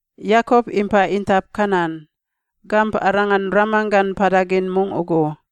Yakop impa intap Kanan, gamp arangan ramanggan mpada gin mungꞌ ugu.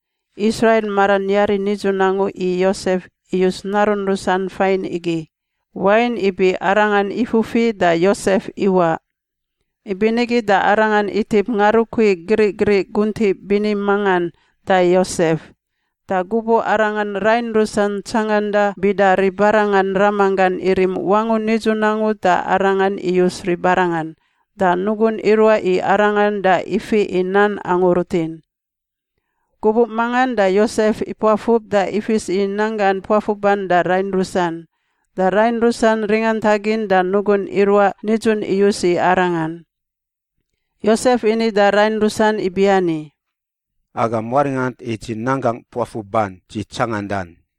Israil maran yari nidzun angu i Yosef iyus narun rusan fain igi, wain ibi arangan ifufi da Yosef iwaꞌ. Ibinigi da arangan itip ngarukui grigriꞌ guntiꞌ bini mangan da Yosef. Da gubuꞌ arangan rain rusan tsanganda bida ribarangan ramanggan irim wangun nidzun angu da arangan iyus ribarangan, da nugun iruaꞌ i arangan da ifiꞌ i nan angu rutin. Gubuꞌ mangan da Yosef ipuafub da ifis i nanggan puafuban da rain rusan. Da rain rusan ringantagin da nugun iruaꞌ nidzun iyus i arangan. Yosef ini da rain rusan ibiani, “Agam waringant i dzi nanggangꞌ puafuban dzi tsangandan: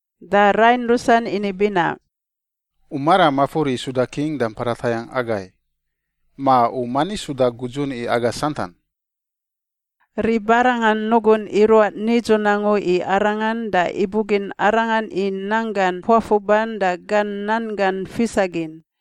Da rain rusan ini binaꞌ, “U maram mafur i suda king da mpada tayangꞌ agai? Ma u mani suda gudzun i aga santan?” Ribarangan nugun iruaꞌ nidzun angu i arangan da ibugin arangan i nanggan puafuban da gan nan gan fisagin.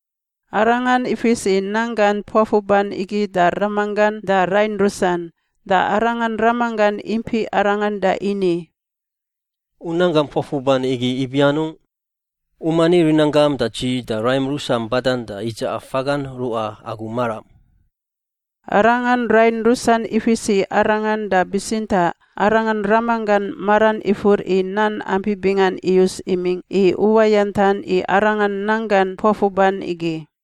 Arangan ifis i nanggan puafuban igi da ramanggan da rain rusan. Da arangan ramanggan impiꞌ arangan da ini, “U nanggam puafuban igi ibi anungꞌ? U mani rinanggam da dzi da raim rusam badan da idzaꞌa fagangꞌ ruꞌa agu maram?” Arangan rain rusan ifis i arangan, da bitsintaꞌ arangan ramanggan maran ifur i nan ampi bingan iyus imingꞌ i uwayantan i arangan nanggan puafuban igi.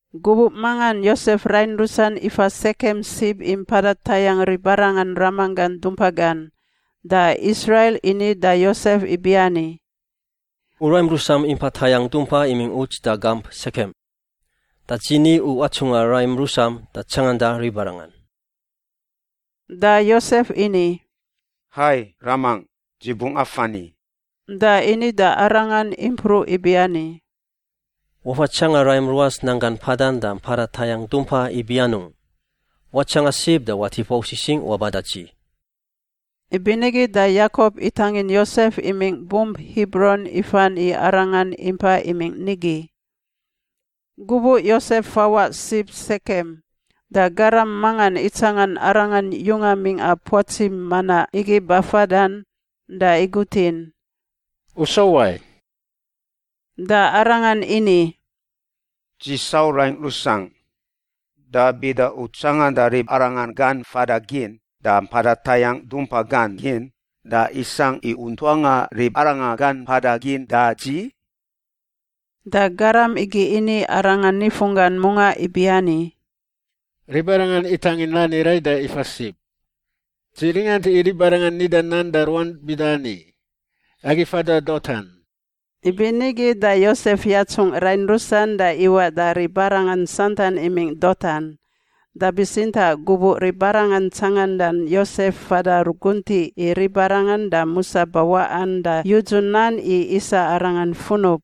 Gubuꞌ mangan Yosef rain rusan ifa Sekem sib i mpada tayangꞌ ribarangan ramanggan dumpa gan, da Israil ini da Yosef ibiani, “U raim rusam impa tayangꞌ dumpa imingꞌ uts da gamp Sekem. Da dzi ni u atsungꞌa raim rusam da tsanganda ribarangan.” Da Yosef ini, “Hai, ramangꞌ. Dzi bungꞌ afan i.” Da ini da arangan impruꞌ ibiani, “Wafa tsanga raim ruas nanggan mpadan da mpada tayangꞌ dumpa ibi anungꞌ. Watsanga sib da watip wau sisingꞌ waba da dzi.” Ibinigi da Yakop itangin Yosef imingꞌ bump Hibron ifan i arangan impa imingꞌ nigi. Gubuꞌ Yosef fawaꞌ sib Sekem, da garam mangan itsangan arangan yunga mingꞌa puatsi manaꞌ igi bafadan da igutin, “U sau wai?” Da arangan ini, “Dzi sau raingꞌ rusangꞌ. Da bida u tsanganda ribarangan gan fada gin da mpada tayangꞌ dumpa gan gin, da isangꞌ i u ntuangꞌa ribarangan gan mpada gin da dzi?” Da garam igi ini arangan nifunggan mungaꞌ ibiani, “Ribarangan itangin nani rai da ifa sib. Dzi ringant i ribarangan nida nan da ruan bida ani, ‘Agi fada Dotan.’” Ibinigi da Yosef yatsungꞌ rain rusan da iwaꞌ da ribarangan santan imingꞌ Dotan. Da bitsintaꞌ gubuꞌ ribarangan tsangandan Yosef fada ruguntiꞌ i ribarangan da musa bawaꞌan, da yudzu nan i isa arangan funub.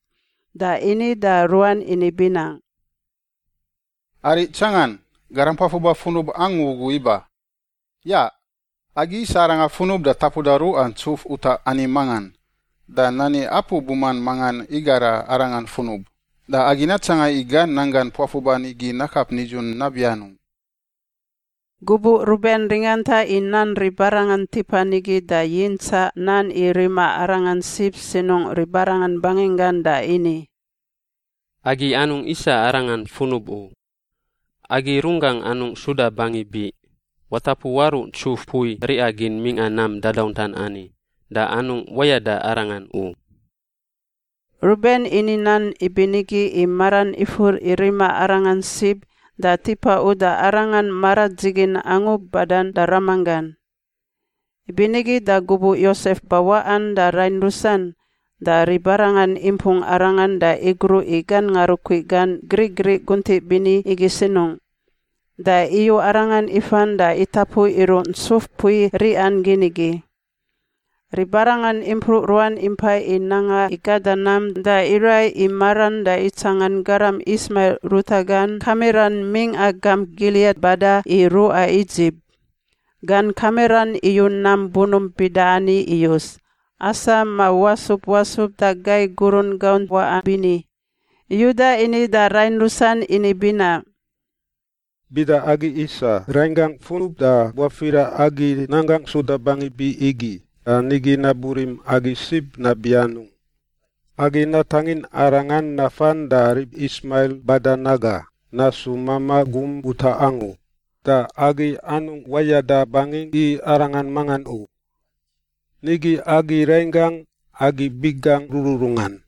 Da ini da ruan ini binaꞌ, “Ariꞌ tsangan! Garam puafuba funub angu ugu iba. Yaꞌ! Agi isa arangan funub da tapuda ruꞌa ntsuf utaꞌ ani mangan, da nani apu buman mangan igara arangan funub. Da agi natsanga i gan nanggan puafuban igi nakap nidzun nabi anungꞌ.” Gubuꞌ Ruben ringanta i nan ribarangan tipan igi da yintsaꞌ nan i rima arangan sib sinungꞌ ribarangan banginggan da ini, “Agi anungꞌ isa arangan funub u. Agi runggangꞌ anungꞌ suda bangi biꞌ. Watapu waruꞌ ntsuf mpui riꞌa gin mingꞌa nam dadauntan ani, da anungꞌ wayada arangan u.” Ruben ini nan ibinigi i maran ifur i rima arangan sib da tipa uda arangan maradzigin angu badan da ramanggan. Ibinigi da gubuꞌ Yosef bawaꞌan da rain rusan, da ribarangan impung arangan da igruꞌ i gan ngarukui gan griꞌgriꞌ guntiꞌ bini igi sinungꞌ da iyu arangan ifan da itapu iruꞌ ntsuf mpui riꞌa gin igi. Ribarangan impruꞌ ruan impai i nanga i gada nam, da iraiꞌ i maran da itsangan garam Ismail ruta gan kamiran mingꞌa gamp Giliat bada i ruꞌa Idzip. Gan kamiran iyu nam bunump bida ani iyus: asam ma wasub wasub da gai gurun gaunt waꞌa bini. Yuda ini da rain rusan ini binaꞌ, “Bida agi isa rainggangꞌ funub da buafira agi nanggangꞌ suda bangi biꞌ igi, da nigi nabu rim agi sib nabi anungꞌ? Agi natangin arangan nafan da rib Ismail badan aga, nasu mamaꞌ gum utaꞌ angu, da agi anungꞌ wayada bangingꞌ i arangan mangan u. Nigi agi rainggangꞌ, agi biꞌ gangꞌ rururungan.”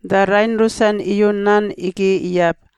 Da rain rusan iyu nan igi iyab.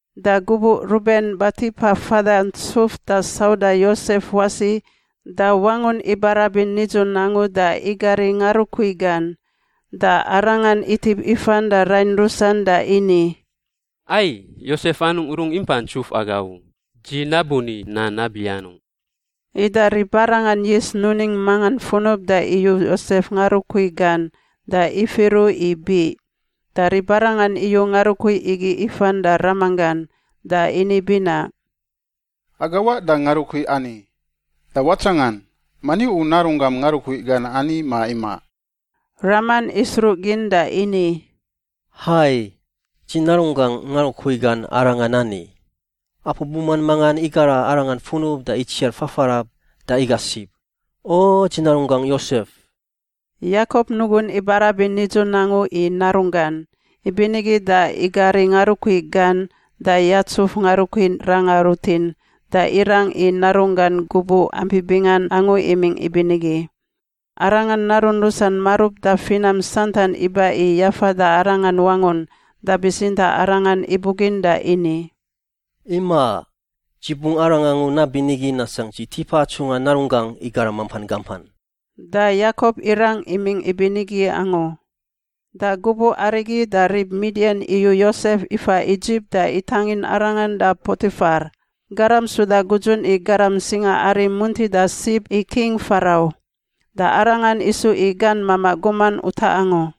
Da gubuꞌ Ruben batipa fada ntsuf da sauda Yosef wasi da wangun ibarabin nidzun angu da igari ngarukui gan. Da arangan itip ifan da rain rusan da ini, “Ai! Yosef anungꞌ rungꞌ impa ntsuf aga u. Dzi nabu ni nan nabi anungꞌ?” Ida ribarangan yis nuning mangan funub da iyu Yosef ngarukui gan da ifiru i biꞌ. Da ribarangan iyu ngarukui igi ifan da ramanggan. Da ini binaꞌ, “Aga waꞌ da ngarukui ani. Da watsangan. Mani u narunggam ngarukui gan ani ma imaꞌ?” Raman isruꞌgin da ini, “Hai, dzi narunggangꞌ ngarukui gan arangan ani. Apu buman mangan igara arangan funub da itsiar fafarab da iga sib. O dzi narunggangꞌ Yosef!” Yakop nugun ibarabin nidzun angu i narunggan, ibinigi da igari ngarukui gan da yatsuf ngarukui ranga rutin, da irang i narunggan gubuꞌ ampi bingan angu imingꞌ ibinigi. Arangan narun rusan marub da finam santan iba i yafada arangan wangun, da bitsintaꞌ arangan ibugin da ini, “Imaꞌ. Dzi bungꞌ arang angu nabiani nasangꞌ dzi tipa atsungꞌa narunggangꞌ i garam mampan gampan.” Da Yakop irang imingꞌ ibinigi angu. Da gubuꞌ arigi da rib Midian iyu Yosef ifa Idzip da itangin arangan da Potifar, garam suda gudzun i garam singaari muntida sib i King Farau, da arangan isu i gan mamaꞌ guman utaꞌ angu.